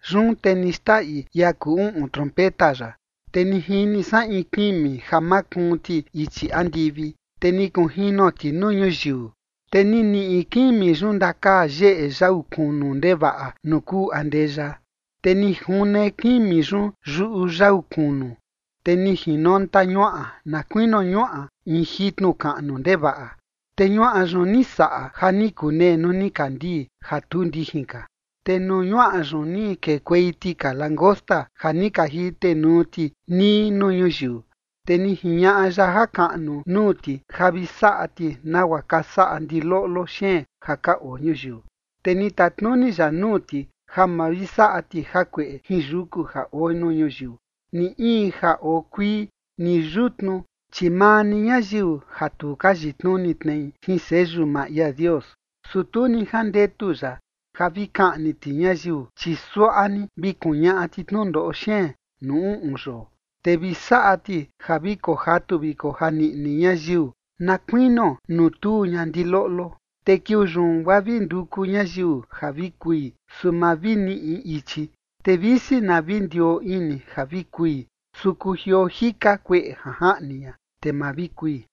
Yun te ni xndaꞌi ia kuu uꞌun trompeta ya. Te ni jini san in kimi ja makuun ti ichi andivi, te ni kunjino ti nuu ñuyiu, te ni niꞌi kimi yun ndakaa yeꞌe yau kunu ndevaꞌa nuu kuu andeya. Te ni june kimi yun yuꞌu yau kunu, te ni jinonta ñuaꞌa na kuinio ñuaꞌa in jitnu kaꞌnu ndevaꞌa. Te ñuaꞌa yun ni saꞌa ja ni kunee nuu nikandii ja tu ndijin ka. Te nuu ñuaꞌa yun ni kekuei tika langosta ja ni ka jitenuu ti nii nuu ñuyiu, te ni jiñaꞌa ya jakaꞌnu nuu ti ja vi saꞌa ti nagua ka saꞌa ndiloꞌlo xeen ja ka oo ñuyiu. Te ni tatnuni ya nuu ti ja ma vi saꞌa ti jakueꞌe jin yuku ja oo nuu ñuyiu, ni in ja oo kuii, ni yutnu, chi maa ni ñayiu ja tu ka yitnuni tnei jin seyu maa ia Dios. Su tu ni jandetu ya ja vi kaꞌni ti ñayiu, chi suaꞌa ni vi kuñaꞌa ti tnundoꞌo xeen nuu uꞌun yoo, te vi saꞌa ti ja vi kojatu vi kojaniꞌni ñayiu na kuinio nuu tuu ña ndiloꞌlo. Te kiuu yun, guaa vi nduku ñayiu ja vi kui, su ma vi niꞌi ichi. Te visi na vi ndioo ini ja vi kui, su kujioo jika kueꞌe ja jaꞌni ña, te ma vi kui.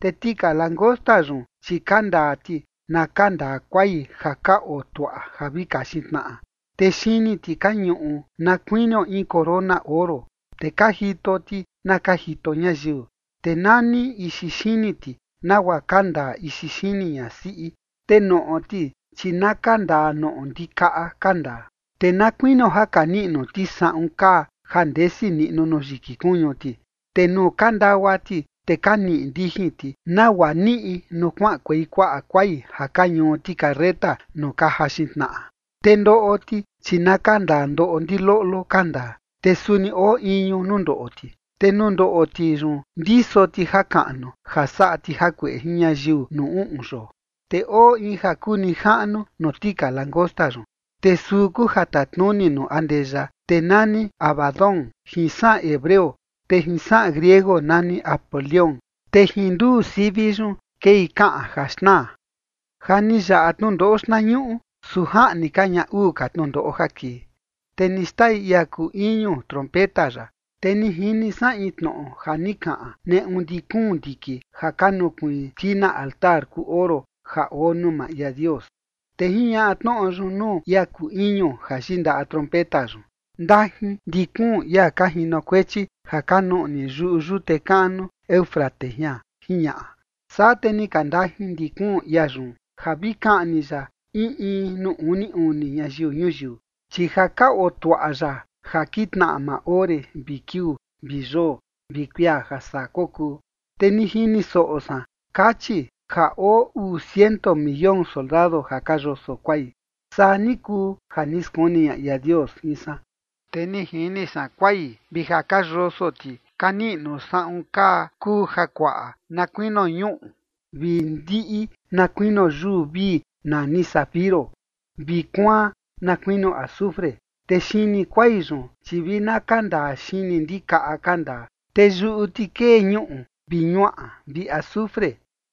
Te tika langosta yun, chi ka ndaa ti na kandaa kuai ja ka oo tuaꞌa ja vi kaxin tnaꞌa. Te xini ti ka ñuꞌu na kuinio in corona oro, te ka jito ti na ka jito ñayiu. Te nani ixi xini ti nagua ka ndaa ixi xini ñasiꞌi, te noꞌo ti, chi na ka ndaa noꞌo ndikaꞌa ka ndaa. Te na kuinio ja ka niꞌnu ti saꞌun kaa ja ndesi niꞌnu nuu yiki kuñu ti. Te nuu ka ndagua ti, te ka niꞌi ndijin ti, nagua niꞌi nuu kuaꞌankuei kuaꞌa kuai ja ka ñuu ti carreta nuu ka jaxin tnaꞌa. Te ndoꞌo ti, chi na ka ndaa ndoꞌo ndiloꞌlo ka ndaa, te suni oo iñu nuu ndoꞌo ti, te nuu ndoꞌo ti yun ndiso ti jakaꞌnu ja saꞌa ti jakueꞌe jin ñayiu nuu uꞌun yoo. Te oo in ja kuu nijaꞌnu nuu tika langosta yun, te suu kuu ja tatnuni nuu andeya, te nani Abadón jin saꞌan hebreo, te jin saꞌan griego nani Apolión, te jin nduu sivi yun kei kaꞌan ja xnaa. Ja ni yaꞌa tnundoꞌo xtnañuꞌu, su jaꞌni ka ña uu ka tnundoꞌo ja kii. Te ni xndaꞌi ia kuu iñu trompeta ya. Te ni jini san in tnoꞌo ja ni kaꞌan neꞌu ndi kuun ndiki ja ka nukuiin skina altar kuu oro ja oo nuu maa ia Dios. Te jiñaꞌa tnoꞌo yun nuu ia kuu iñu ja yindaꞌa trompeta yun: ―Ndajin ndi kuun ia ja ka jinokuechi ja ka nuꞌni yuꞌu yute kaꞌnu Éufrates jian ―jiñaꞌa. Saa te ni ka ndajin ndi kuun ia yun, ja vi kaꞌni ya in in nuu uni uni ñayiu ñuyiu, chi ja ka oo tuaꞌa ya ja kitnaꞌa maa ore vi kiuu vi yoo vi kuia ja saa kokuu. Te ni jini soꞌo san kachi ja oo uu ciento millón soldado ja ka yoso kuai. Saa ni kuu ja ni skuni ña ia Dios jin san, te ni jini san kuai, vi ja ka yoso ti ka niꞌnu saꞌun kaa kuu jakuaꞌa na kuinio ñuꞌu, vi ndiꞌi na kuinio yuu vii nani zafiro vi kuaan na kuinio azufre. Te xini kuai yun, chi vi na ka ndaa xini ndikaꞌa ka ndaa, te yuꞌu ti kee ñuꞌu vi ñuaꞌa vi azufre.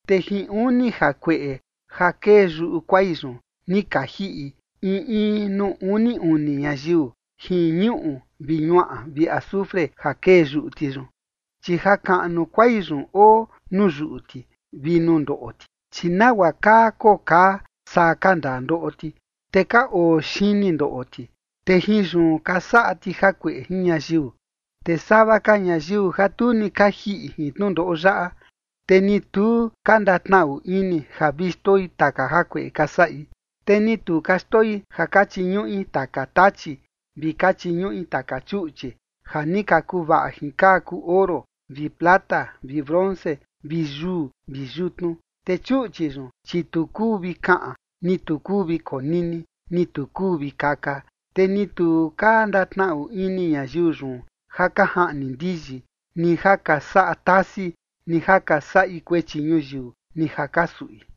Te jin uni jakueꞌe ja kee yuꞌu kuai yun ni ka jiꞌi in in nuu uni uni ñayiu, jin ñuꞌu vi ñuaꞌa vi azufre ja kee yuꞌu ti yun. Chi jakaꞌnu kuai yun oo nuu yuꞌu ti vi nuu ndoꞌo ti, chi nagua kaa koo kaa saa ka ndaa ndoꞌo ti, te ka oo xini ndoꞌo ti, te jin yun ka saꞌa ti jakueꞌe jin ñayiu. Te sava ka ñayiu ja tu ni ka jiꞌi jin tnundoꞌo yaꞌa, te ni tu ka ndatnaꞌu ini ja vi xndoi taka jakueꞌe ka saꞌi. Te ni tu ka xndoi ja ka chiñuꞌi taka tachi vi ka chiñuꞌi taka chuꞌchi ja ni kuvaꞌa jin kaa kuu oro vi plata vi bronce vi yuu vi yutnu. Te chuꞌchi yun, chi tu kuu vi kaꞌan, ni tu kuu vi konini, ni tu kuu vi kaka. Te ni tu ka ndatnaꞌu ini ñayiu yun ja ka jaꞌni ndiyi, ni ja ka saꞌa tasi, ni ja ka saꞌi kuechi ñuyiu, ni ja ka suꞌi.